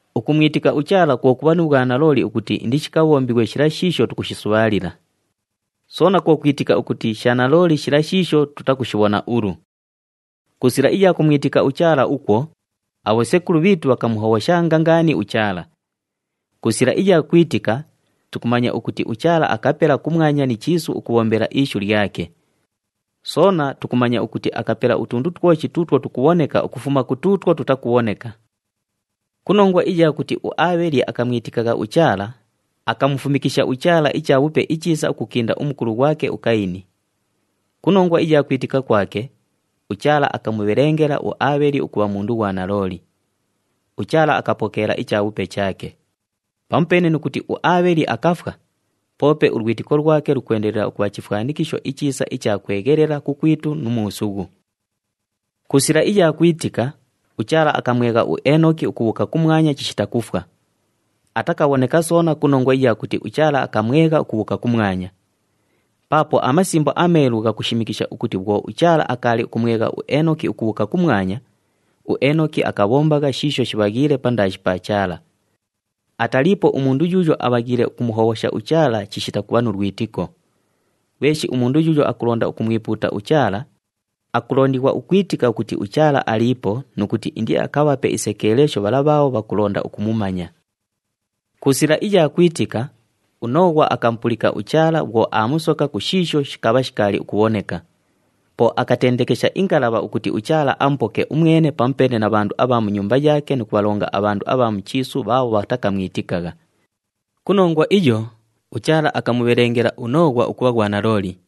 Ukumwitika uChaala kwo kubha nu bhwanalooli ukuti indishikabhombighwe shila shiisho tukushisubhaalila. Soona kwo kwitika ukuti sha nalooli shila shiisho tutakushibhona ulu. Ku sila iya kumwitika uChaala ukwo, abhosekulu bhiitu bhakamuhobhoshanga ngaani uChaala. Ku sila iya kwitika, tukumanya ukuti uChaala akapela kumwanya ni chiisu ukubhombela ishu lyake. Soona tukumanya ukuti akapela utundu twoshi tuutwo tukubhoneka ukufuma ku tuutwo tutakubhoneka. Ku nongwa iya kuti uAabheli akamwitikagha uChaala, akamufumikisha uChaala ichabhupe ichiisa ukukinda umukulu ghwake uKayini. Ku nongwa iya kwitika kwake, uChaala akamubhelengela uAabheli ukubha mundu ghwanalooli. UChaala akapokeela ichabhupe chaake. Pamupeene nu kuti uAabheli akafwa, poope ulwitiko lwake lukwendelela ukubha chifwanikisho ichiisa icha kweghelela kukwitu nu muusughu. Ku sila iya kwitika, uChaala akamwegha uEenoki ukubhuuka kumwanya chishita kufwa. Atakabhoneka soona ku nongwa iya kuti uChaala akamwegha ukubhuuka kumwanya. Paapo aMasimbo aMeelu ghakushimikisha ukuti bhwo uChaala akaali ukumwegha uEenoki ukubhuuka kumwanya, uEenoki akabhombagha shiisho shibhaghiile pandaashi pa Chaala. Ataliipo umundu yuuyo abhaghiile ukumuhobhosha uChaala chishita kubha nu lwitiko. Ghweshi umundu yuuyo akulonda ukumwipuuta uChaala, akulondighwa ukwitika ukuti uChaala aliipo nu kuti indiakabhape isekeelesho bhala bhaabho bhakulonda ukumumanya. Ku sila iya kwitika, uNooghwa akamupulika uChaala bhwo aamusoka ku shiisho shikabha shikaali ukubhoneka. Po akatendekesha ingalabha ukuti uChaala amupoke umwene pamupeene na bhandu abha mu nyumba yaake nu kubhalonga abhandu abha mu chiisu bhaabho bhatakamwitikagha. Ku nongwa iyo, uChaala akamubhelengela uNooghwa ukubha ghwanalooli.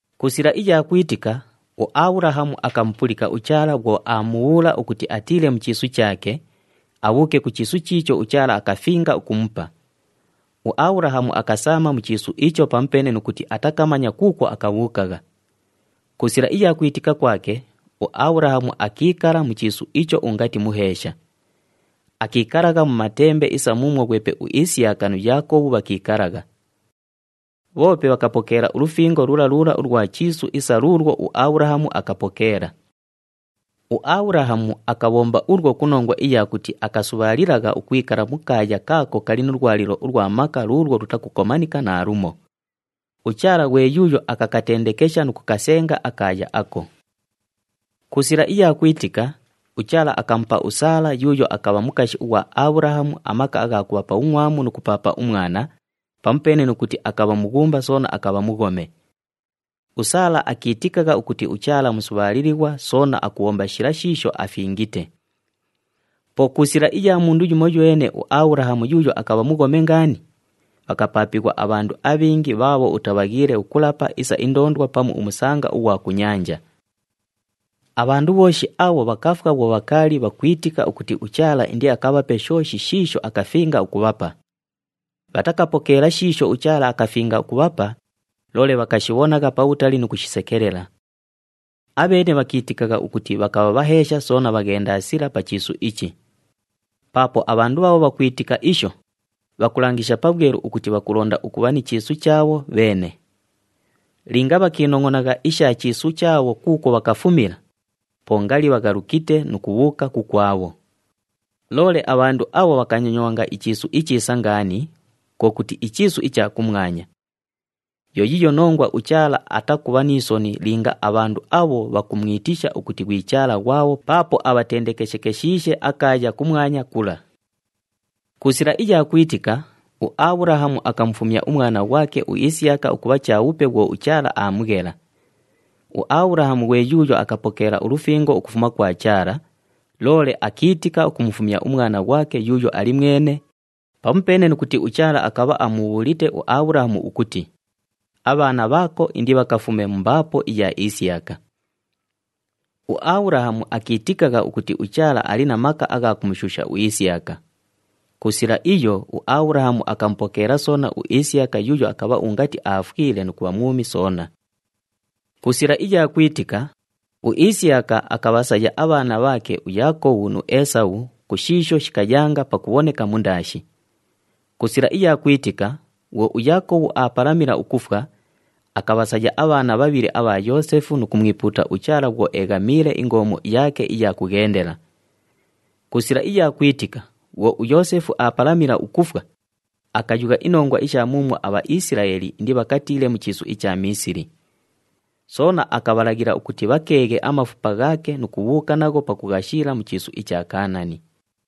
Ku sila iya kwitika, uAbhulahamu akamupulika uChaala bhwo aamubhuula ukuti atiile mu chiisu chaake, abhuuke ku chiisu chiicho uChaala akafinga ukumupa. UAbhulahamu akasaama mu chiisu icho pamupeene nu kuti atakamanya kuukwo akabhuukagha. Ku sila iya kwitika kwake, uAbhulahamu akiikala mu chiisu icho ungati muheesha. Akiikalagha mu matembe isa muumwo ghwepe uIsiyaka nu Yaakobhu bhakiikalagha. Bhoope bhakapokeela ulufingo lula lula ulwa chiisu isa luulwo uAbhulahamu akapokeela. UAbhulahamu akabhomba ulwo ku nongwa iya kuti akasubhaalilagha ukwikala mu kaaya kaako kali nu lwalilo ulwa maka luulwo lutakukomanika naalumo. UChaala ghwe yuuyo akakatendekesha nu kukasenga akaaya ako. Ku sila iya kwitika, uChaala akamupa uSaala yuuyo akabha mukashi ughwa Abhulahamu amaka agha kubha pa bhungʼwamu nu kupaapa umwana, pamupeene nu kuti akabha mughumba soona akabha mughome. USaala akiitikagha ukuti uChaala musubhaalilighwa soona akubhomba shila shiisho afingite. Po ku sila iya mundu yumoywene uAbhulahamu yuuyo akabha mughome ngaani, bhakapaapighwa abhandu abhingi bhaabho utabhaghiile ukulapa isa indoondwa pamu umusanga ughwa ku nyanja. Abhandu bhooshi abho bhakafwa bhwo bhakaali bhakwitika ukuti uChaala indiakabhape shooshi shiisho akafinga ukubhapa. Bhatakapokeela shiisho uChaala akafinga ukubhapa, loole bhakashibhonagha pabhutali nu kushisekelela. Abheene bhakiitikagha ukuti bhakabha bhaheesha soona bhaghendasila pa chiisu ichi. Paapo abhandu bhaabho bhakwitika isho, bhakulangisha pabhwelu ukuti bhakulonda ukubha ni chiisu chaabho bheene. Linga bhakiinongʼonagha isha chiisu chaabho kuukwo bhakafumila, po ngali bhaghalukite nu kubhuuka kukwabho. Loole abhandu abho bhakanyonywanga ichiisu ichiisa ngaani, kwo kuti ichiisu icha kumwanya. Yo yiiyo nongwa uChaala atakubha ni soni linga abhandu abho bhakumwitisha ukuti ghwi Chaala ghwabho paapo abhatendekeshekeshiishe akaaya kumwanya kula. Ku sila iya kwitika, uAbhulahamu akamufumya umwana ghwake uIsiyaka ukubha chabhupe bhwo uChaala aamughela. UAbhulahamu ghwe yuuyo akapokeela ulufingo ukufuma kwa Chaala, loole akiitika ukumufumya umwana ghwake yuuyo ali mwene, pamupeene nu kuti uChaala akabha amubhuulite uAbhulahamu ukuti, “Abhaana bhaako indibhakafume mu mbaapo iya Isiyaka.” UAbhulahamu akiitikagha ukuti uChaala ali na maka agha kumushuusha uIsiyaka. Ku sila iyo, uAbhulahamu akamupokeela soona uIsiyaka yuuyo akabha ungati aafwile nu kubha mwumi soona. Ku sila iya kwitika, uIsiyaka akabhasaya abhaana bhaake uYaakobhu nu Eesabhu ku shiisho shikayanga pakubhoneka mundaashi. Ku sila iya kwitika, bhwo uYaakobhu aapalamila ukufwa, akabhasaya abhaana bhabhili abha Yoosefu nu kumwipuuta uChaala bhwo eeghamiile ingoomo yaake iya kughendela. Ku sila iya kwitika, bhwo uYoosefu aapalamila ukufwa, akayugha inongwa isha muumwo aBhaisilaeli indibhakatiile mu chiisu icha Miisili. Soona akabhalaghila ukuti bhakeeghe amafupa ghaake nu kubhuuka nagho pakughashiila mu chiisu icha Kaanani.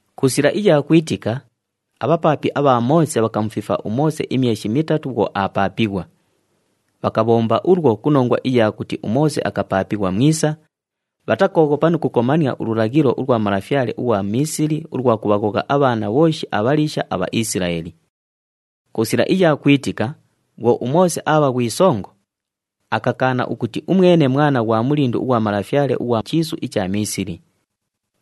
Ku sila iya kwitika, abhapaapi abha Moose bhakamufifa uMoose imyeshi mitatu bhwo aapaapighwa. Bhakabhomba ulwo ku nongwa iya kuti uMoose akapaapighwa mwisa, bhatakooghopa nu kukomania ululaghilo ulwa malafyale ughwa Miisili ulwa kubhaghogha abhaana bhooshi abhaliisha aBhaisilaeli. Ku sila iya kwitika, bhwo uMoose aabha ghwi songo, akakaana ukuti umwene mwana ghwa mulindu ughwa malafyale ughwa chiisu icha Miisili.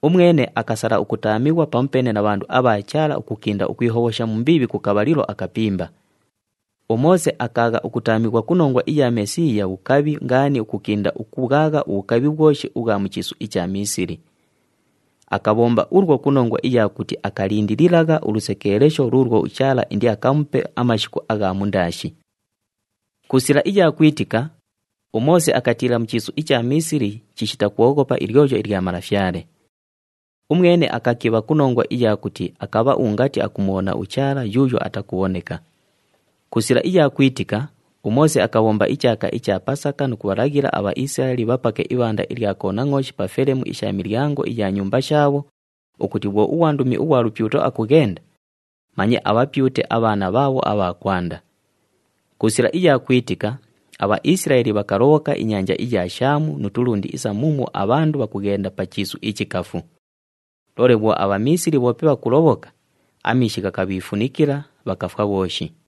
Umwene akasala ukutaamighwa pamupeene na bhandu abha Chaala ukukinda ukwihobhosha mu mbiibhi ku kabhalilo akapimba. UMoose akaagha ukutaamighwa ku nongwa iya Mesiiya bhukabhi ngaani ukukinda ukubhwagha ubhukabhi bhwoshi ubhwa mu chiisu icha Miisili. Akabhomba ulwo ku nongwa iya kuti akalindililagha ulusekeelesho luulwo uChaala indiakamupe amashiku agha mundaashi. Ku sila iya kwitika, uMoose akatiila mu chiisu icha Miisili chishita kwoghopa ilyoyo ilya malafyale. Umwene akakibha ku nongwa iya kuti akabha ungati akumubhona uChaala yuuyo atakubhoneka. Ku sila iya kwitika, uMoose akabhomba ichaaka icha Pasaka nu kubhalaghila aBhaisilaeli bhapake ibhanda ilya konangʼooshi pa felemu isha milyango iya nyumba shaabho, ukuti bhwo ughwandumi ughwa lupyuto akughenda, manye abhapyute abhaana bhaabho abha kwanda. Ku sila iya kwitika, aBhaisilaeli bhakalobhoka inyanja iya Shaamu nu tulundi isa muumwo abhandu bhakughenda pa chiisu ichikafu. Loole bhwo aBhamiisili bhoope bhakulobhoka, amiishi ghakabhiifunikila, bhakafwa bhooshi.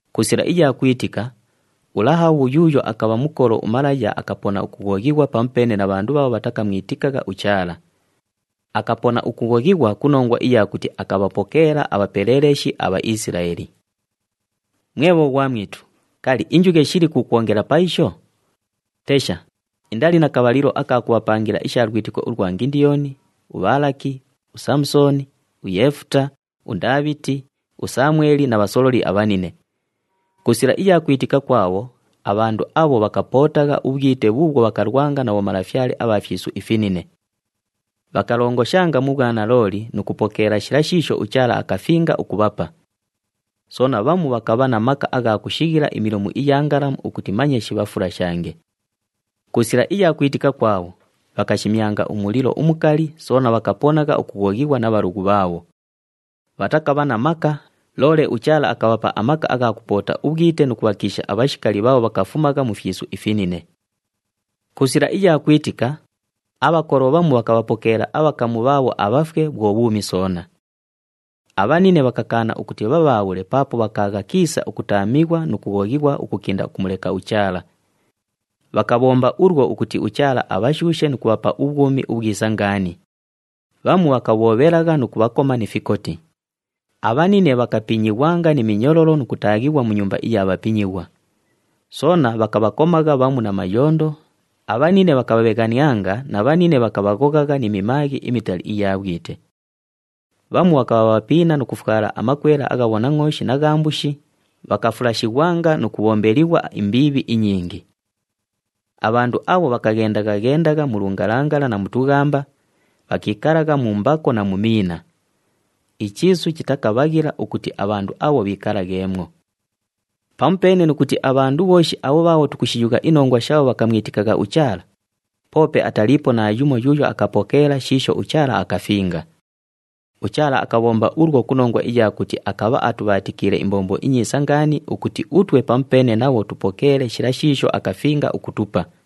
Ku sila iya kwitika, uLahabhu yuuyo akabha mukolo umalaya akapona ukughoghighwa pamupeene na bhandu bhaabho bhatakamwitikagha uChaala. Akapona ukughoghighwa ku nongwa iya kuti akabhapokeela abhapeleeleshi aBhaisilaeli. Mwe bhoghwamwitu, kali, injughe shiliku ukwongela pa isho? Tesha, indali na kabhalilo aka kubhapangila isha lwitiko ulwa Ngindiyoni, uBhaalaki, uSaamusooni, uYeefuta, uNdaabhiti, uSamweli na bhasololi abhanine. Ku sila iya kwitika kwabho, abhandu abho bhakapootagha ubhwite bhuubhwo bhakalwanga na bhomalafyale abha fyisu ifinine. Bhakalongoshanga mu bhwanalooli nu kupokeela shila shiisho uChaala akafinga ukubhapa. Soona bhamu bhakabha na maka agha kushighila imilomu iya ngalamu ukuti manye shibhafulashange. Ku sila iya kwitika kwabho, bhakashimyanga umulilo umukali, soona bhakaponagha ukughoghighwa na bhalughu bhaabho. Bhatakabha na maka, loole uChaala akabhapa amaka agha kupoota ubhwite nu kubhakiisha abhashikali bhaabho bhakafumagha mu fyisu ifinine. Ku sila iya kwitika, abhakolo bhamu bhakabhapokeela abhakamu bhaabho abhafwe bhwo bhuumi soona. Abhanine bhakakaana ukuti bhabhaabhule paapo bhakaagha kiisa ukutaamighwa nu kughoghighwa ukukinda ukumuleka uChaala. Bhakabhomba ulwo ukuti uChaala abhashuushe nu kubhapa ubhwumi ubhwisa ngaani. Bhamu bhakabhoobhelagha nu kubhakoma ni fikoti. Abhanine bhakapinyighwanga ni minyololo nu kutaaghighwa mu nyumba iya bhapinyighwa. Soona bhakabhakomagha bhamu na mayondo, abhanine bhakabhabheghanianga na bhanine bhakabhaghoghagha ni mimaaghi imitali iya bhwite. Bhamu bhakabha bhapiina nu kufwala amakwela agha bhonangʼooshi na gha mbushi, bhakafulashighwanga nu kubhombelighwa imbiibhi inyingi. Abhandu abho bhakaghendagha-ghendagha mu lungalangala na mu tughamba, bhakiikalagha mu mbako na mu miina. Ichiisu chitakabhaghila ukuti abhandu abho bhiikalagheemwo. Pamupeene nu kuti abhandu bhooshi abho bhaabho tukushiyugha inongwa shaabho bhakamwitikagha uChaala, poope ataliipo naayumo yuuyo akapokeela shiisho uChaala akafinga. UChaala akabhomba ulwo ku nongwa iya kuti akabha atubhaatikiile imbombo inyiisa ngaani ukuti utwe pamupeene nabho tupokeele shila shiisho akafinga ukutupa.